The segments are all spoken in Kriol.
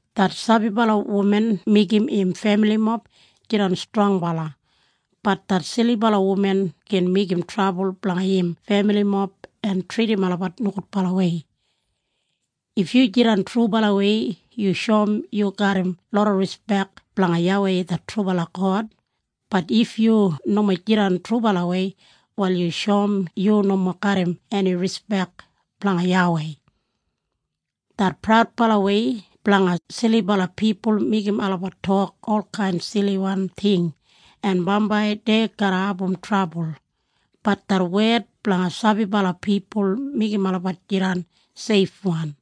Det sabibala wuman meigim im femilimob jidan strongbala, bat det silibala wuman gin meigim trabul blanga im femilimob en tridim olabat nogudbalawei. If yu jidan trubalawei yu shoum yu garram loda rispek blanga YAWEI det trubala God, bat if yu nomo jidan trubalawei wal yu shoum yu nomo garram eni rispek blanga YAWEI. Det praudbalawei blanga silibala pipul meigim olabat tok olkain siliwan ting en bambai dei garra abum trabul, bat det wed blanga sabibala pipul meigim olabat jidan seifwan.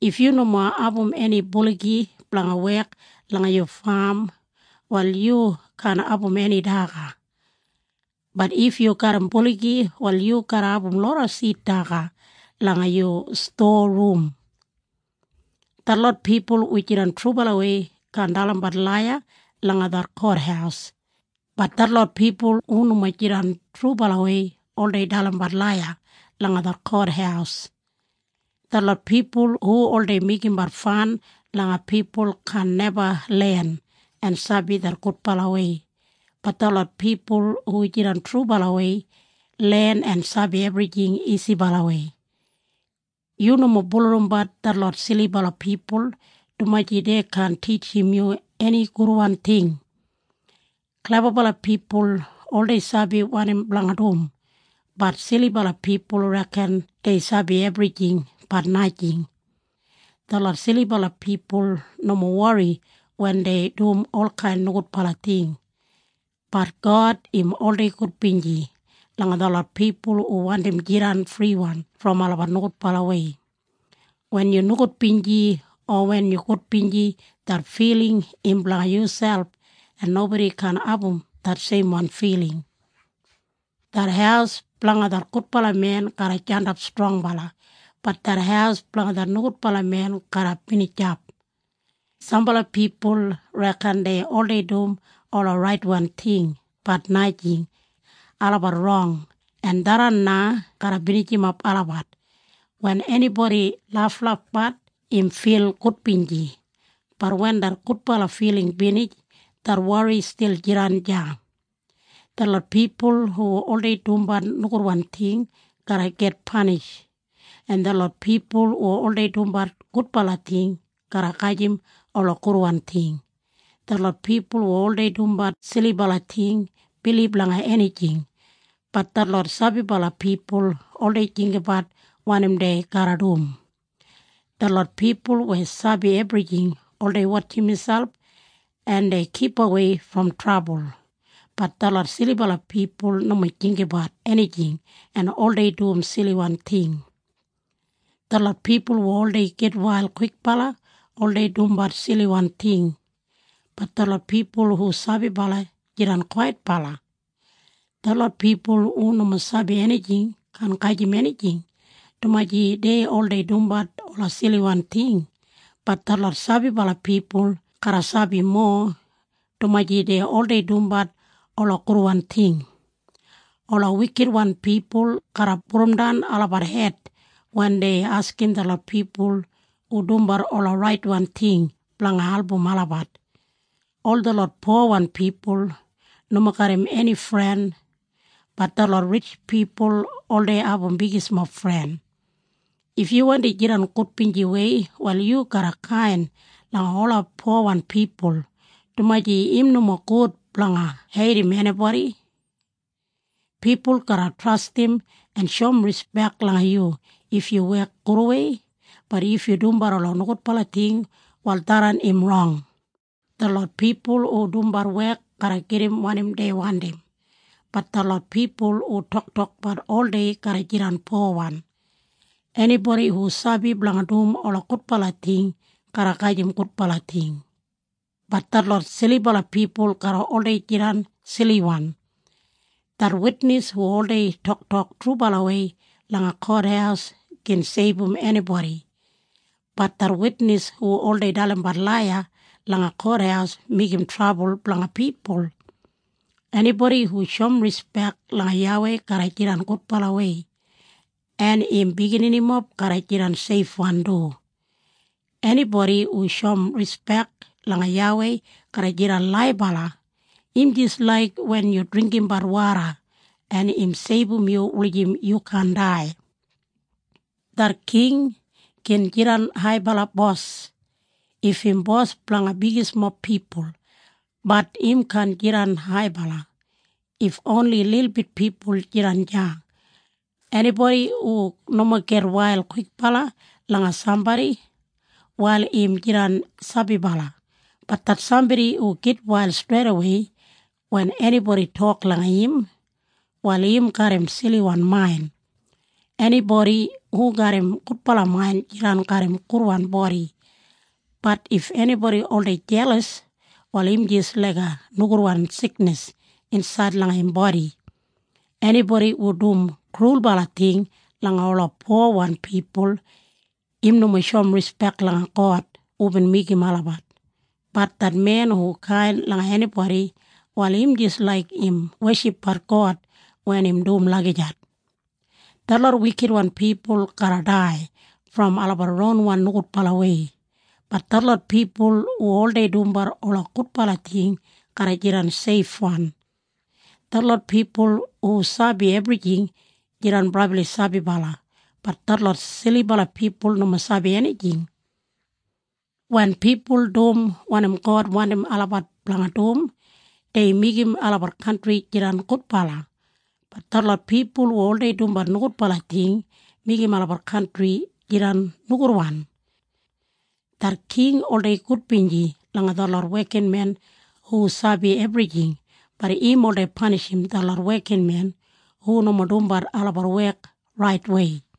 If yu nomo abum eni buligi blanga wek langa yu fam wal yu kaan abum eni daga, bat if yu garram buligi wal yu garra abum loda sid daga langa yu stowa rum. Detlot pipul hu jidan trubalawei kaan dalimbat laiya langa det kothaus, bat detlot pipul hu nomo jidan trubalawei oldei dalimbat laiya langa det kothaus. Detlot pipul hu oldei meigimbat fan langa pipul kaan neba len en sabi det gudbalawei, bat detlot pipul hu jidan trubalawei len en sabi ebrijing isibalawei. Yu nomo bulurrumbat detlot silibala pipul, dumaji dei kaan titjim yu eni gudwan ting. Klebabala pipul oldei sabi wanim blanga dum, but silibala pipul reken dei sabi ebrijing, bat najing. Detlot silibala pipul nomo wori wen dei dum olkain nogudbala ting, bat God im oldei gudbinji langa detlot pipul hu wandim jidan friwan brom olabat nogudbalawei. Wen yu nogudbinji o wen yu gudbinji det filing im blanga yuselp, en nobodi kaan abum det seimwan filing. Det haus blanga det gudbala men garra jandap strongbala, bat det haus blanga det nogudbala men garra binijap. Sambala pipul reken dei oldei dum ola raitwan ting, bat najing. Olabat rong, en tharran na garra binijimap olabat. Wen enibodi laflafbat im fil gudbinji, bat wen det gudbala filing binij, det wori stil jidan deya. Detlot pipul hu oldei dumbat nogudwan ting garra git panish, en detlot pipul hu oldei dumbat gudbala ting garra gajim ola gudwan ting. Detlot pipul hu oldei dumbat silibala ting bilib langa enijing, bat detlot sabibala pipul oldei jinggabat wanim dei garra dum. Detlot pipul weya sabi ebrijing oldei wotjim miselp en dei kipawei brom trabul, bat detlot silibala pipul nomo jinggabat enijing en oldei dum siliwan ting. Detlot pipul hu oldei gitwail kwikbala oldei dumbat siliwan ting, bat detlot pipul hu sabibala, jidan kwaitbala. Detlot pipul hu nomo sabi enijing kaan gajim enijing, dumaji dei oldei dumbat ola siliwan ting, bat detlot sabibala pipul garra sabi mowa, dumaji dei oldei dumbat ola gudwan ting. Ola wikitwan pipul garra pudumdan olabat hed wen dei askim detlot pipul hu dumbat ola raitwan ting blanga album olabat. Ol detlot powan pipul nomo garram eni fren, bat detlot ritj pipul oldei abum bigismob fren. If yu wandi jidan gudbinjiwei wal yu garra kain langa ola powan pipul, dumaji im nomo gud blanga heidim enibodi. Pipul garra trastim en shoum rispek langa yu if yu wek gudwei, bat if yu dumbat ola nogudbala ting wal tharran im rong. Detlot pipul hu dumbat wek garra gedim wanim dei wandim, bat detlot pipul hu toktokbat oldei garra jidan powan. Enibodi hu sabi blanga dum ola gudbala ting garra gajim gudbala ting, bat detlot silibala pipul garra oldei jidan siliwan. Det witnis hu oldei toktok trubalawei langa kothaus gin seibum enibodi, bat det witnis hu oldei dalimbat laiya langa kothaus meigim trabul blanga pipul. Enibodi hu shoum rispek langa YAWEI garra jidan gudbalawei en im bigininimob garra jidan seifwan du. Enibodi hu shoum rispek langa YAWEI garra jidan laibala. Im jis laik wen yu dringgimbat woda en im seibum yu wulijim yu kaan dai. Det king gin jidan haibala bos if im bos blanga bigismob pipul, bat im kaan jidan haibala if oni lilbit pipul jidan deya. Enibodi hu nomo gitwail kwikbala langa sambodi, wal im jidan sabibala, bat det sambodi hu gitwail streidawei wen enibodi tok langa im, wal im garram siliwan main. Enibodi hu garram gudbala main jidan garram gudwan bodi, bat if enibodi oldei jelas, wal im jis laiga nogudwan siknis insaid langa im bodi. Enibodi hu dum krulbala ting langa ola powan pipul, im nomo shoum rispek langa God hubin meigim olabat, bat det men hu kain langa enibodi, wal im jis laik im weshipbat God wen im dum lagijat. Detlot wikitwan pipul garra dai brom olabat ronwan nogudbalawei, bat detlot pipul hu oldei dumbat ola gudbala ting garra jidan seifwan. Detlot pipul hu sabi ebrijing jidan brabli sabibala, bat detlot silibala pipul nomo sabi enijing. Wen pipul dum wanim God wandim olabat blanga dum dei meigim olabat kantri jidan gudbala, bat detlot pipul hu oldei dumbat nogudbala ting meigim olabat kantri jidan nogudwan. Det king oldei gudbinji langa detlot wekinmen hu sabi ebrijing, bat im oldei panishim detlot wekinmen hu nomo dumbat olabat wek raitwei.